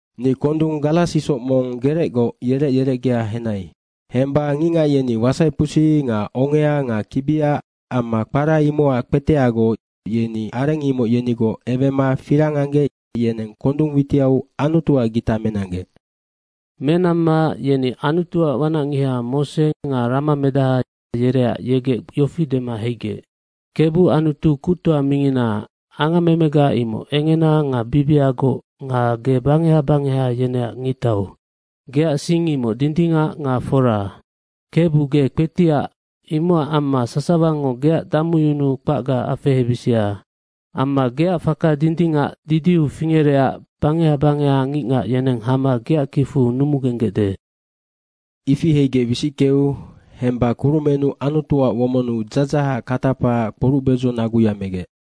Ni kondung garas isoc mong gerecgoc yerec yerecgea henai. Hemba ngicngac yeni wasaipusi nga ongea nga kibia amma kpara imocac kpeteagoc, yeni areng imoc yenigoc ewema firang anggec yeneng kondung witiau Anutuac gita menanggec. Menamma yeni Anutuac wanacngiha Mose nga ramamedaha, yereac yegec yofi dema heigec, “Kebu Anutu Kuctoa mingina, angammemega imoc engena nga bibiagoc nga ge bangeha bangeha yeneac ngictau. Geac sing imoc dindingac nga fora. Kebu ge kpetiac, imocac amma sasawango geac damuyunuu kpacga afehebisia. Amma geac faka dindingac didiu fingerecac bangeha bangeha ngicngac yeneng hama geac kicfu numugenggecde.” Ifi heigec wisickeu hemba kurumennu Anutuac womonnu dzadzahac katapaac kporucbedzo naguya megec.